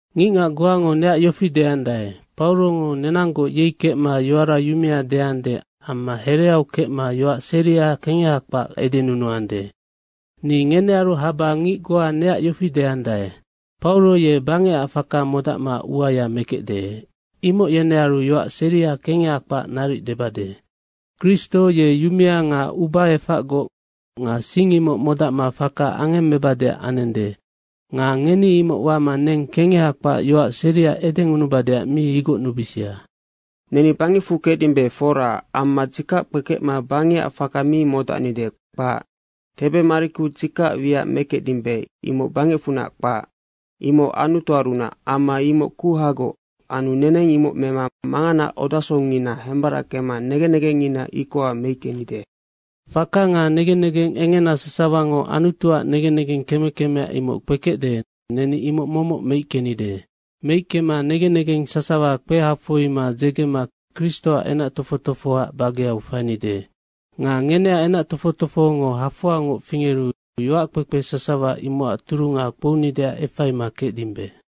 Ngicngac goango neac yofi deandae, “Paurongo nenanggoc yei kecma yoara yumea deande amma hereau kecma yoac seria kengeha kpac edenunuande.” Ni ngenearu haba ngic goa neac yofi deandae, “Pauro ye bangecac faka modacma uaya mekecde.” imoc yenearu yoac seria kengeha kpac naric debade. Kristo ye yumea nga ubaefacgoc nga sing imoc modacma faka angemmebadeac anende. Nga ngeni imoc wama neng kengeha kpac yoac seria edengunubadeac mi igocnubisia. Neni bangecfu kecdimbe, fora. Amma dzikac kpekecma bangecac faka mi modacnide, kpac. Tebe mariku dzikacac wiac mekecdimbe, imoc bangecfunac kpac. Imoc Anutuarunac amma imoc kuhagoc anu neneng imoc mema manganaac odasongngina hembarackema negen negengngina ikoha meickenide. Faka nga negen negeng engena sasawango Anutuac negen negeng keme kemea imoc kpekecde, neni imoc momoc meickenide. Meickema negen negeng sasawa kpehafoima dzegema Kristoac enac tofoc tofohoac bageau fainide. Nga ngeneac enac tofoc tofohongo hafoangoc fingeru yoackpekpe sasawa imocac turunga kpounideac efaima kecdimbe.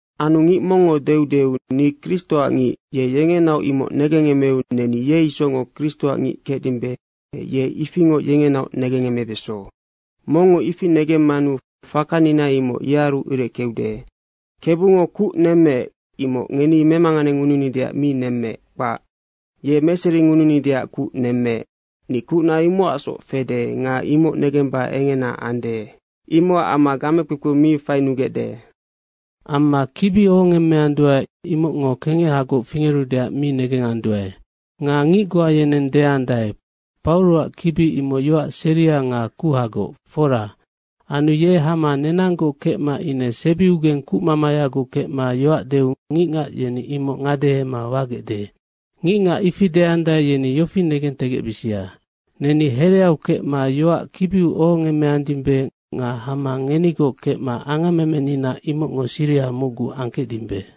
Anu ngic mongngo deudeu, “Ni Kristoac ngic.” Ye yengenaoc imoc negengemeu, neni ye isocngoc Kristoac ngic kecdimbe. Ye ifingoc yengenaoc negengemebeso. Mongngo ifi negemmanu fakanina imoc yearu ireckeude. Kebungo kuc nemmeec, imoc ngeni memanganengununideac mi nemmeec, kpac. Ye meseringununideac kuc nemmeec. Ni kucna imocacsoc fede nga imoc negemba engena ande. Imocac amma gamekpekpeu mi fainugecde. Amma kibi ohongemmeanduae, imocngo kengehagoc fingerudeac mi negenganduae. Nga ngic goa yeneng deandae, “Pauroac kibi imoc yoac seria nga kuhagoc, fora. Anu ye hama nenanggoc kecma ine sebiugeng kucmamayagoc kecma yoac deu ngicngac yeni imoc ngadehema wagecde.” Ngicngac ifi deandae, yeni yofi negentegecbisia, neni hereau kecma yoac kibiu ohongemmeandimbe nga hama ngenigoc kecma angammemenina, imocngo siriha mocgu angkecdimbe.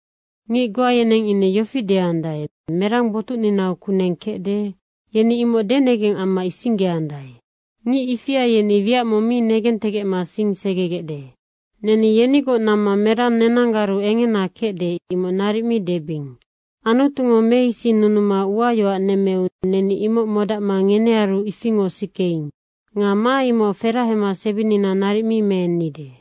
Ngic goa yeneng ine yofi deandae, “Merang botucninau kuneng kecde?” yeni imoc denegeng amma isinggeandae. Ngic ifia yeni wiac mong mi negentegecma sing segegecde. Neni yenigoc namma merang nenanggaru engena kecde, imoc naric mi debing. Anutungo meisinnunuma uayoac nemmeu neni imoc modacma ngenearu ifingoc sikeing. Nga ma imoc ferahama sebinina naric mi meennide.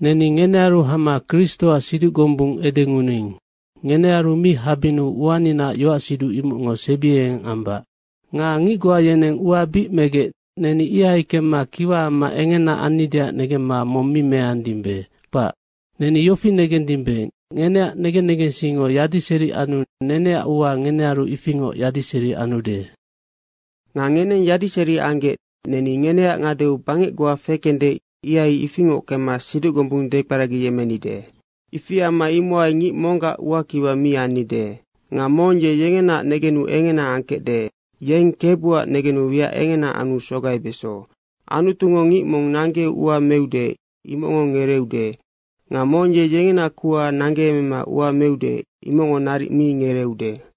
Neni ngenearu hama Kristoac siduc gombung edengunuing. Ngenearu mi habinnu uaninaac yoacsiduc imocngo sebiengeng ambac. Nga ngic goa yeneng ua bic megec, neni ihai kemma kiwa amma engena annideac negemma mong mi meandimbe, kpac. Neni yofi negendimbe, ngeneac negen negensingngo yadiseri anu neneac ua ngenearu ifingoc yadiseri anude. Nga ngeneng yadiseri anggec neni ngeneac ngadeau bangec goa fekende, ihai ifingoc kemma siduc gombung dekperagiyemmenide. Ifi amma imohai ngic monggac uaac kiwa mi annide. Nga mong ye yengenaac negenu engena angkecde, yeng KEBUAC negenu wiac engena anu sogaibeso. Anutungo ngic mong nanggeu ua meude, imocngo ngereeude. Nga mong ye yengena kuha nanggeemema ua meude, imoc naric mi ngereeude.